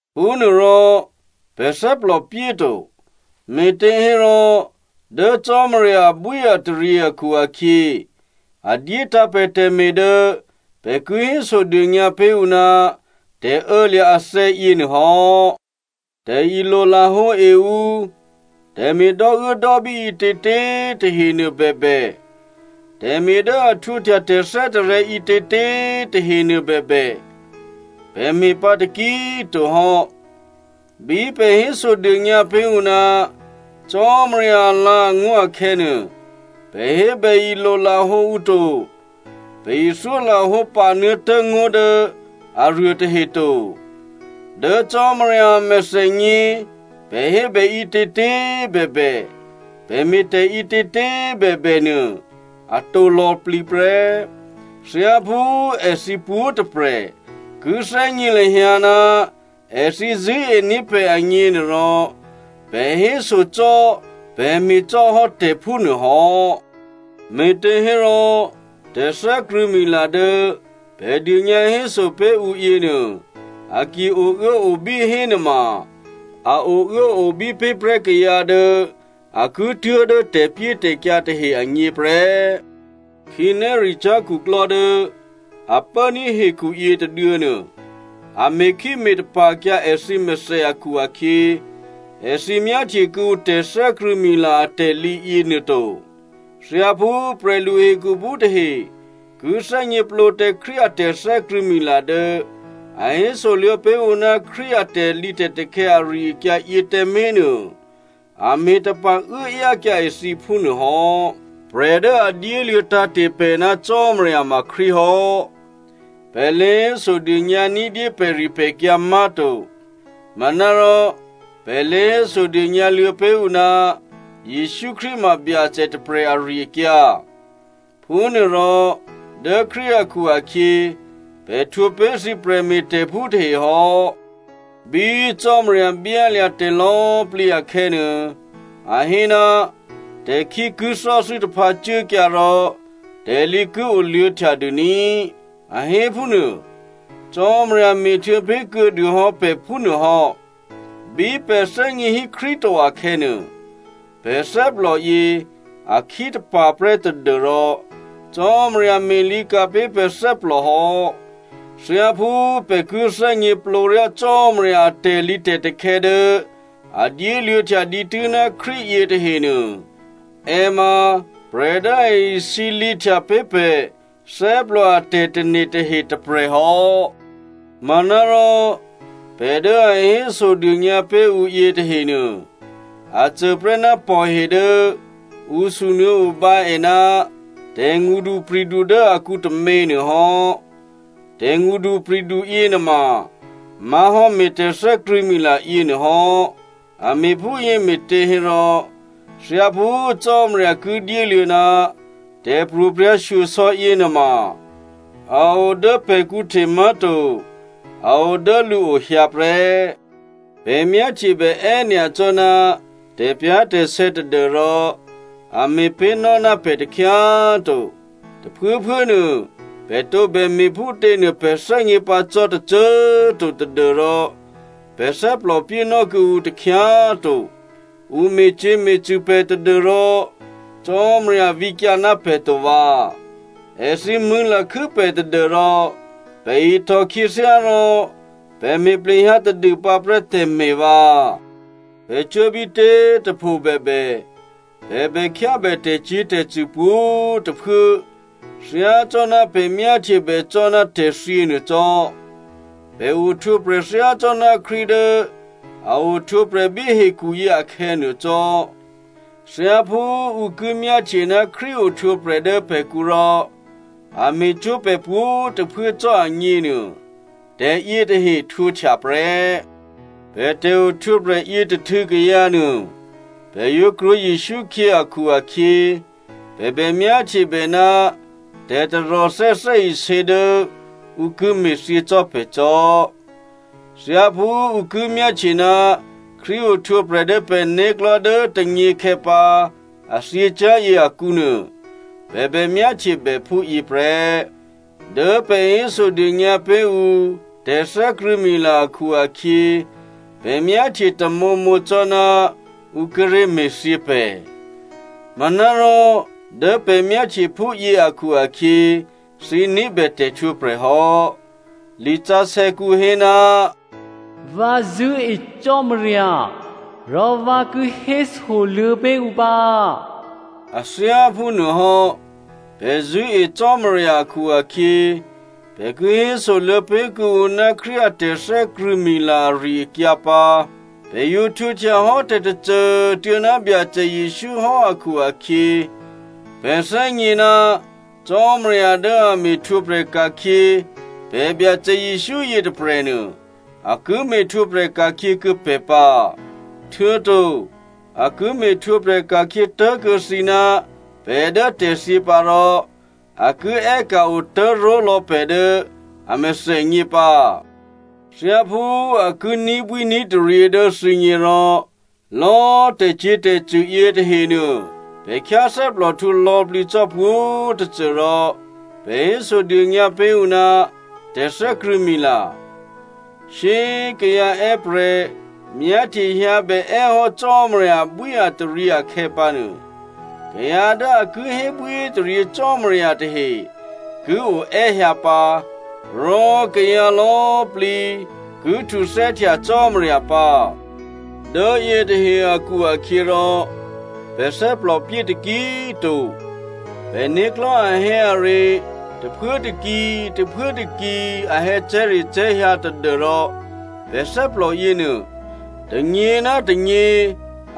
Phúnuôrò pè̤ thè́plòpyé to, me̤těhérò dố Cò́marya abwíataryě akhu-akhyě, a dyétǎ̤ pè̤ tè̤me̤ dố pè̤ ki hésodônyǎ pé̤ ǔ ná tè̤ô̌lya̤ athè̌ yěnuô hò́. Tè̤ilo lahǒe ǔ, tè̤me̤ dò́uốdò́bí ǐtětě꤮ tahe nuôbèbè, tè̤me̤ dố a htwǒhtya tè̤thè́tarè̤̌ ǐtětě꤮ tahenuô bèbè, pè̤ me̤pǎ taki꤮ to hò́. Bí pè̤ hésodônyǎ pé̤ ǔ ná Cò́marya alǎ̤angó̤ akhè̌nuô, pè̤ hébè ilolahǒ ǔ to, pè̤ ithyólahǒ panuô̌tố̤ ngó̤ dố aruôtahe to. Dố Cò́marya a mèthènyě, pè̤ hébè ǐtětě꤮ bèbè, pè̤ me̤tè̤ ǐtětě꤮ bèbè nuô, atǒ lò̌plǐ prè́. Thyáphú èthǐ pwǒ̤꤮ tôprè̤ ki thè́gně lahyǎ ná èthǐ zṳ̂́ení̤ pè̤ agněnuôrò, pè̤ hésocò́, pè̤ me̤cò́ hò́ tè̤ phúnuô hò́. Me̤těhérò, tè̤thè́krṳ̂̌mila dố pè̤ dônyǎhéso pé̤ ǔ yěnuô, a ki ouốobí hénuôma, a ouốobí pé̤ prè́ kayǎ dố a ki tuố̤dố tè̤pyétè̤kyǎ tahe agně prè́. Khǐnéricyá̤ khuklò́ dố a pốní̤ hekhu yětôduô̌nuô, a me̤khí me̤tapa̤kyǎ èthǐ mèthè akhu-akhyě, èthǐ myáhtye kuô̌ǔ tè̤thè́krṳ̂̌mila atè̤lǐ yěnuô to. Thyáphú prè̤lu hekhuphú tahe ki thè́gněplǒ tǎ Krístu a tè̤thè́krṳ̂̌mila dố a hésoluô̌ pé̤ ǔ ná Krístu a tè̤lǐtè̤takhè̌ ari-akyǎ yě tǎmé̤ nuô, a me̤tapa̤ uốáyákyǎ èthǐ phúnuô hò́. Prè̤ dố a dyéluô̌ tǎ̤te̤ pè̤ ná Cò́marya ma Krístu hò́. Pè̤ lě hésodônyǎ ní̤dyé pè̤ripè̤kyǎ má̤to. Manárò pè̤ lě hésodônyǎ luô̌ pé̤ ǔ ná Jesǔ Krístu ma Byacè tôprè̤ ari-akyǎ. Phúnuôrò dố Krístu akhu-akhyě, pè̤ htwǒpé̤ thǐ prè̤me̤tè̤phú tahe hò́. Bí Cò́marya byálya̤ tè̤lò̌꤮ plǐ akhè̌nuô, a hé, “Tè̤khí ki thò́thû́ taphǎ cuốkyǎ rò tè̤lǐ ki oluô̌htya dû ní꤮,” a hé phúnuô. Cò́marya me̤htuô̌ pé̤ kuô̌dû hò́ pè̤ phúnuô hò́. Bí pè̤ thè́gně hí Krístu to akhè̌nuô, pè̤ thè́plò yě a khítapa̤ prè́ tadû́rò Cò́marya me̤lǐka̤ pé̤ pè̤ thè́plò hò́. Thyáphú pè̤ ki thè́gněplǒryá Cò́marya a tè̤lǐtè̤takhè̌ dố a dyéluô̌htya dǐtû́ ná Krístu yětahenuô, è ma prè̤ dố a isǐlǐhtya pé̤ pè̤ thè́plò a tè̤tane̤ tahe tôprè̤ hò́. Manárò pè̤ dố a hésodônyǎ pé̤ ǔ yětahenuô, a cô prè́ ná pò̤he dố ǔ sunuô̌obǎ è ná tè̤ngṳdupri̤du dố akǔ tômě nuôhò́. Tè̤ngṳdupri̤du yěnuôma má̤hò́ me̤ tè̤thè́krṳ̂̌mila yěnuô hò́. A me̤phúyě me̤těhérò thyáphú Cò́marya ki dyéluô̌ ná tè̤pro̤prya̤shyosò̌ yěnuôma a o dố pè̤kǔ hte má̤to, a o dố lǔo hyǎ prè́. Pè̤ myáhtyebè è́nyacò́ ná tè̤pyá̤tè̤sè̌ tadû́rò a me̤pé̤nò́ ná pè̤ takhyá꤮ to. Tôphuốphuốnuô pè̤ tǒbè me̤phútě nuô pè̤ thè́gně pǎ cò́ tôcô꤮ to tadû́rò pè̤ thè́plòpyé nò́ kuô̌ǔ takhyá꤮ to. Ǔ me̤cyě̤me̤cṳ̂ pè̤ tadû́rò Cò́marya vǐkyǎ ná pè̤ to vǎ. Èthǐ mṳ̂̌lakhû́ pè̤ tadû́rò pè̤ ihtò khyěthyá rò pè̤ me̤ plehyǎ tadûpǎ prè́ tè̤me̤ vǎ. Pè̤ cuố bítě꤮ tôpho bèbè, pè̤ bèkhyábè tè̤cyě̤tè̤cṳ̂ pwǒ̤꤮ tôphuố thyácò́ná pè̤ myáhtyebè cò́ ná tè̤thyě nuô cò́. Pè̤ ohtwǒprè̤ thyácò́ná Krístu dố a ohtwǒprè̤ bí hekhuyě akhè̌nuô cò́. Thyáphú ǔ ki myáhtye ná Krístu ohtwǒprè̤ dố pè̤kǔ rò a me̤cwó̤ pè̤ pwǒ̤꤮ tôphuố cò́ agněnuô, tè̤yětahe htwǒhtya prè́. Pè̤ tè̤ohtwǒprè̤ yětôhtû̌ kayǎ nuô, pè̤ yǒ krwǒ Jesǔ khyě akhu-akhyě, pè̤ bè myáhtyebè ná tè̤taròthè́ thè́isě dố ǔ ki me̤thyě cò́ pè̤ cò́. Thyáphú ǔ ki myáhtye ná Krístu ohtwǒprè̤ dố pè̤né̤klò̤́ dố tônyěkhè̌ pǎ a thyěcyá̤yě akǔnuô, pè̤ bè myáhtyebè phúyě prè́. Dố pè̤ hésodônyǎ pé̤ ǔ tè̤thè́krṳ̂̌mila akhu-akhyě pè̤ myáhtye tamǒmǒ cò́ná ǔ kíré̤ me̤thyě pè̤. Manárò dố pè̤ myáhtye phúyě akhu-akhyě, thǐ ní̤bè tè̤htwǒprè̤ hò́. Lisǎsè̌kǔ hé, “Vǎ zṳ̂́e Cò́marya, rò vǎ ki hésoluô̌ pé̤ ǔ pǎ,” a thyáphúnuôhò́, pè̤ zṳ̂́e Cò́marya akhu-akhyě, pè̤ ki hésoluô̌ pé̤ kuô̌ǔ ná Krístu a tè̤thè́krṳ̂̌mila ari-akyǎ pǎ. Pè̤ yǒ htwǒhtya hò́ tè̤tôcô꤮ tuô̌ ná Byacè Jesǔ hò́ akhu-akhyě, pè̤ thè́gně ná Cò́marya dố a me̤htwǒprè̤ ka̤khyě pè̤ Byacè Jesǔ yětôprè̤nuô, a ki me̤htwǒprè̤ ka̤khyě kuô̌ pè̤ pǎ. Htuô̌to a ki me̤htwǒprè̤ ka̤khyě tố̤kuô̌ thǐ ná pè̤ dố tè̤thyě pǎ rò a ki è́ka̤ otố̤ró̤lò̌ pè̤ dố a mèthènyě pǎ. Thyáphú a ki ní̤bwíní̤taryě dố thǐgně rò, lò̌꤮ tè̤cyě̤tè̤cṳ̂ yětahenuô, pè̤ khyáthè́plòhtǔ lò̌plǐ cò́ pwǒ̤꤮ tôcô rò pè̤ hésodônyǎ pé̤ ǔ ná tè̤thè́krṳ̂̌mila. Shyé꤮ kayǎ è́prè̤ myáhtye hyǎbè è́ hò́ Cò́marya abwíataryě akhè̌pǎnuô, kayǎ dố a ki hébwíhétaryě Cò́marya tahe ki o è́hyǎ pǎ, rò kayǎ lò̌꤮ plǐ ki htuthè́htya Cò́marya pǎ. Dố yětahe akhu-akhyěrò pè̤ thè́plòpyé taki꤮ to. Pè̤né̤klò̤́ ahè̌are tôphuốtôki, tôphuốtôki a hè̌cè̤́recè̤́ hyǎ tadû́rò pè̤ thè́plò yěnuô, tônyě ná tônyě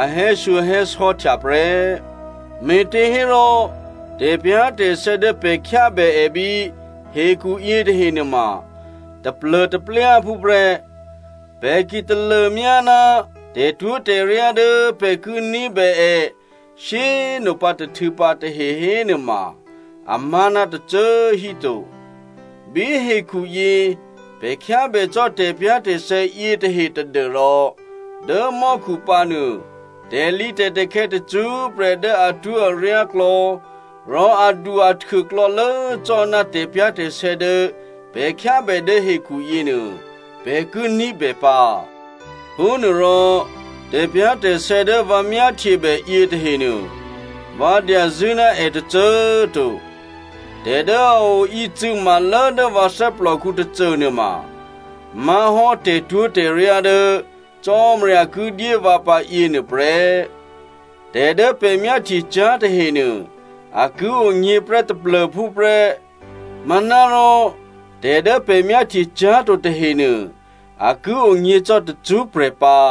a hè̌shyohè̌sò̌htya prè́. Me̤těhérò tè̤pyá̤tè̤sè̌ dố pè̤ khyábè è bí hekhu yětahe nuôma taplô̤taplyáphú prè́. Pè̤ ki talômyá ná tè̤twó̤tè̤ryá dố pè̤ ki ní̤bè è shyé꤮ nopǎ tôhtû̌ pǎ tahe hénuôma, amá̤ ná tôcô꤮ hí to. Bí hekhuyě pè̤ khyábè cò́ tè̤pyá̤tè̤sè̌ yětahe tadû́rò dố mò́khu pǎnuô tè̤lǐtè̤takhè̌ tacṳ́prè̤ dố atwó̤aryá klò̌, rò adu-ahtuô klò̌lố cò́ ná tè̤pyá̤tè̤sè̌ dố pè̤ khyábè dố hekhu yěnuô, pè̤ ki ní̤bè pǎ. Phúnuôrò, tè̤pyá̤tè̤sè̌ dố vǎ myáhtyebè yětahenuô, vǎ dyazṳ̂́ ná è tôcô꤮ to. Tè̤ dố a o ícû̌ma lố dố vǎ thè́plòkǔ tôcônuôma má̤hò́ tè̤twó̤tè̤ryá dố Cò́marya ki dyé vǎ pǎ yěnuô prè́. Tè̤ dố pè̤ myáhtyecyá̤ tahenuô, a ki onyě̤ prè́ taplô̤phú prè́, manárò tè̤ dố pè̤ myáhtyecyá̤to tahenuô, a ki onyě̤ cò́ tacṳ́prè̤ pǎ.